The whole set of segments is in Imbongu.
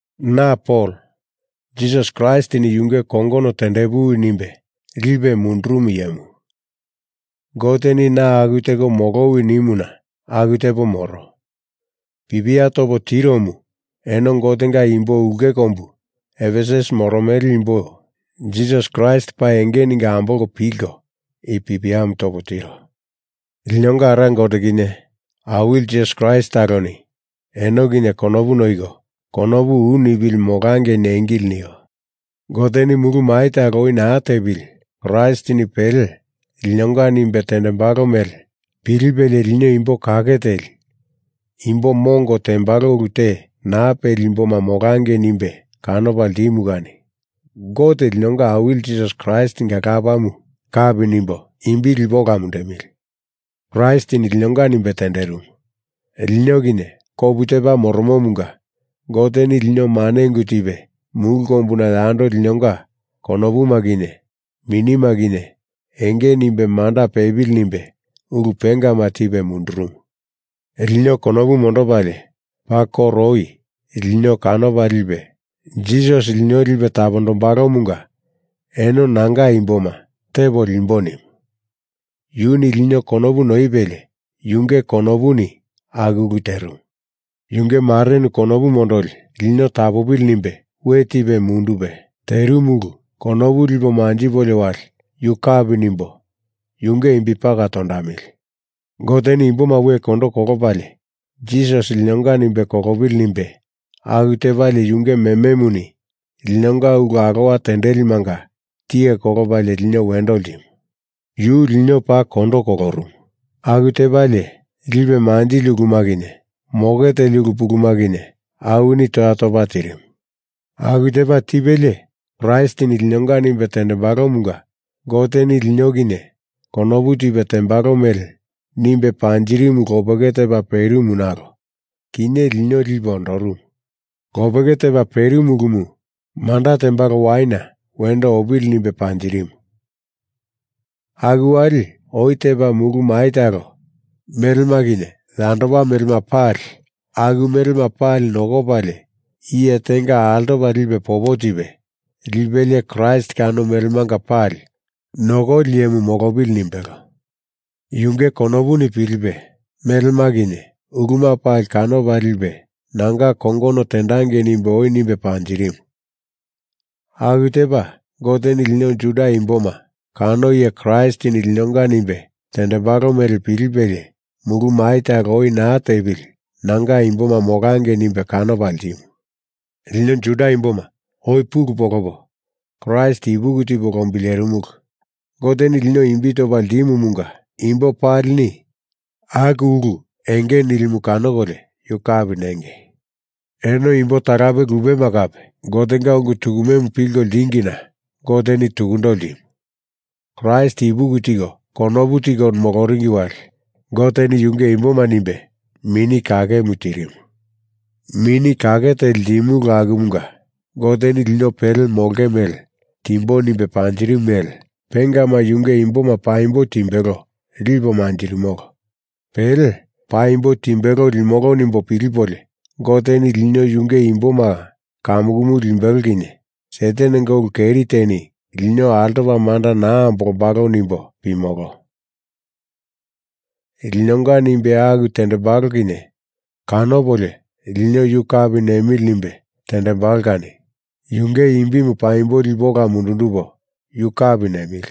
Na Pol, Jisasi Kraistini yunge kongono tendepuwi nimbe lipe mundurumo iyemu. Goteni na aku teko molowi nimuna aku tepo moro. Pipia topo tiromu eno Gotenga imbo ulke kombu Efesus moromele imbo Jisasi Kraist paa enge ningo ambolko pilko i pipiamu topo tiro. Linonga Ara Gote kinye Awili Jisasi Kraist taloni eno kinye konopu noiko konopu u nipili molangei nengili nio. Goteni mulu mai talo oi naa tepili Kraistini pele linonga nimbe tendembalo mele pilipelie lino imbo kake teli imbo mongo tembalo ulu te naa peli imboma molangei nimbe kanopa ltimu kani Gote linonga Awili Jisasi Kraistinga Lapamu kapi nimbo imbi lipo ola mundemili. Kraistini linonga nimbe tenderimu lino kinye kopu tepa moromomunga Goteni lino mane ungu tipe mulu kombuna yando linonga konopuma kinye minima kinye enge nimbe manda pepili nimbe ulu pengama tipe mundurumu. Lino konopu mondopalie paa koro oi lino kanopa lipe Jisasi lino lipe tapondombalomunga eno nanga imboma tepo limbo nimu. Yuni lino konopu noipelie yunge konopuni aku ulu terimu. Yunge marenu konopu mondoli lino tapopili nimbe we tipe mundupe terimu ulu konopu lipo manjipolio wali yu kapi nimbo yunge imbi paka tondamili. Goteni imboma we kondo kolopalie Jisasi linonga nimbe kolopili nimbe aku tepalie yunge mememuni linonga ulu alowa tendelimanga tiye kolopalie lino wendo ltimu. Yu lino paa kondo kolorumu. Aku tepalie lipe manjili uluma kinye moke teli ulu pulumu kinye awini toya topa tirimu. Aku tepa tipelie Kraistini linonga nimbe tendembalomunga Goteni lino kinye konopu tipe tembalo mele nimbe panjirimumu lopeke tepa perimu nalo kinye lino lipe ondorumu. Lopeke tepa perimu ulumu manda tembalo waina wendo opili nimbe panjirimu. Aku wali oi tepa mulu mai talo melema kinye yandopa melema pali aku melema pali nokopalie iye tenga altopa lipe popo tipe liepili Kraist kano melemanga pali nokoli iyemu molopili nimbelo. Yunge konopuni pilipe melema kinye uluma pali kanopa lipe nanga kongono tendangei nimbe oi nimbe panjirimu. Aku tepa Goteni lino Juda imboma kano iye Kraistini linonga nimbe tendembalo mele pilipelie mulu mai talo oi naa tepili nanga imboma molangei nimbe kanopa ltimu. Lino Juda imboma oi pulu polopo Kraist ipuki tipo lombilerimulu. Goteni lino imbi topa ltimumunga imbo palini aku ulu enge nilimu kanokolio yu kapi nengei. Eno imbo talape lupema kape Gotenga ungu tukumemu pilko ltingina Goteni tukundo ltimu. Kraist ipuki tiko kopu teko moloringi wali Goteni yunge imboma nimbe Mini Kakemu tirimu. Mini Kake Teli ltimulu akumunga Goteni lino pele molonge mele timbo nimbe panjirimu mele pengama yunge imboma paimbo timbelo lipo manjirimolo. Pele paimbo timbelo limolo nimbo pilipolio Goteni lino yunge imboma kamukumu limbelo kinye Satanenga ulu keri teni lino altopa manda naa ambolombalo nimbo pimolo. Linonga nimbe aku tendembalo kinye kanopolio lino yu kapi nemili nimbe tendembalo kani yunge imbimu paimbo lipo ola mundundupo yu kapi nemili.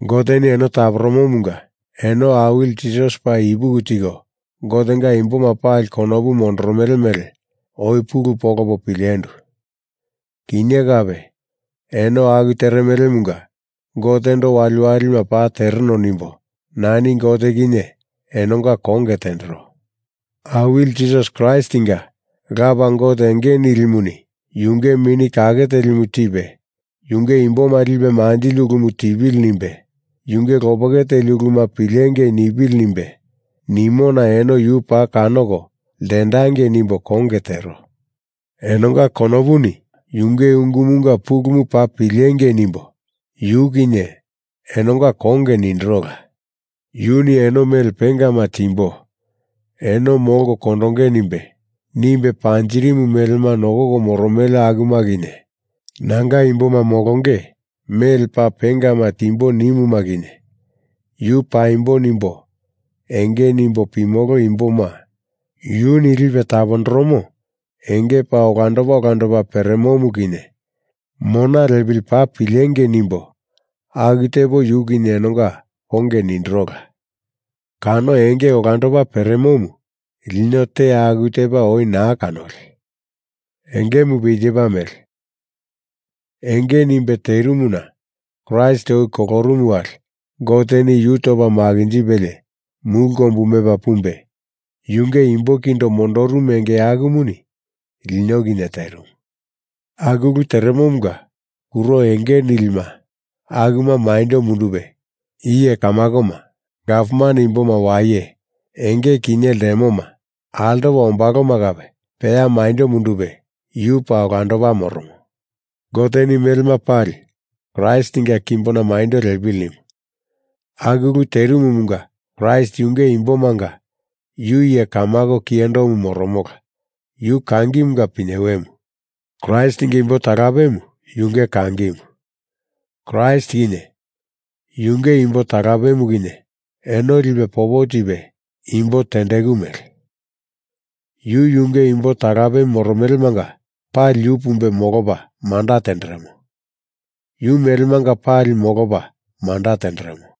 Goteni eno taporomomunga eno Awili Jisasi paa ipuki tiko Gotenga imboma pali konopu mondoromele mele oi pulu polopo pilendu. Kinye kape eno aku teremelemunga Gotendo waliwalima paa tereno nimbo nani Gote kinye enonga konge tendero. Awili Jisasi Kraistinga Lapa Gote Enge Nilimuni yunge Mini Kake Telimu tipe yunge imboma lipe manjili ulumu tipili nimbe, yunge lopeke teli uluma pilengei nipili nimbe nimona eno yu paa kanoko ltendangei nimbo konge tero. Enonga konopuni yunge ungumanga pulumu paa pilengei nimbo yu kinye enonga konge nindirola. Yuni eno mele pengama timbo eno molko kondonge nimbe, nimbe panjirimu melema nokoko moromele akuma kinye nanga imboma molonge mele paa pengama timbo nimuma kinye yu paimbo nimbo enge nimbo pimolo imboma yuni lipe tapondoromo enge paa olandopa olandopa peremomu kinye mona lepili paa pilengei nimbo aku tepo yu kinye enonga konge nindirola. Kano enge olandopa peremomu lino te aku tepa oi naa kanoli. Engemupe i tepa mele. Enge nimbe terimuna Kraist oi kolorumu wali Goteni yu topa makinjipelie mulu kombu mepa pumbe yunge imbo kindo mondorumu enge akumuni lino kinye terimu. Aku ulu teremomunga kuro enge nilima akuma maindo mundupe iye kamakoma gavman imboma waye enge kinye ltemoma altopa ombaloma kape peya maindo mundupe yu paa olando moromo. Goteni melema pali Kraistinga kimbona maindo lepili nimu. Aku ulu terimumunga Kraist yunge imbomanga yu iye kamako kiyendomu moromola. Yu kangimunga pinyewemu. Kraistinga imbo talapemu yunge kangimu. Kraist kinye yunge imbo talapemu kinye eno lipe popo tipe imbo tendeku mele. Yu yunge imbo talape moromelemanga pali yu pumbe molopa manda tenderemo. Yu melemanga pali molopa manda tenderemo.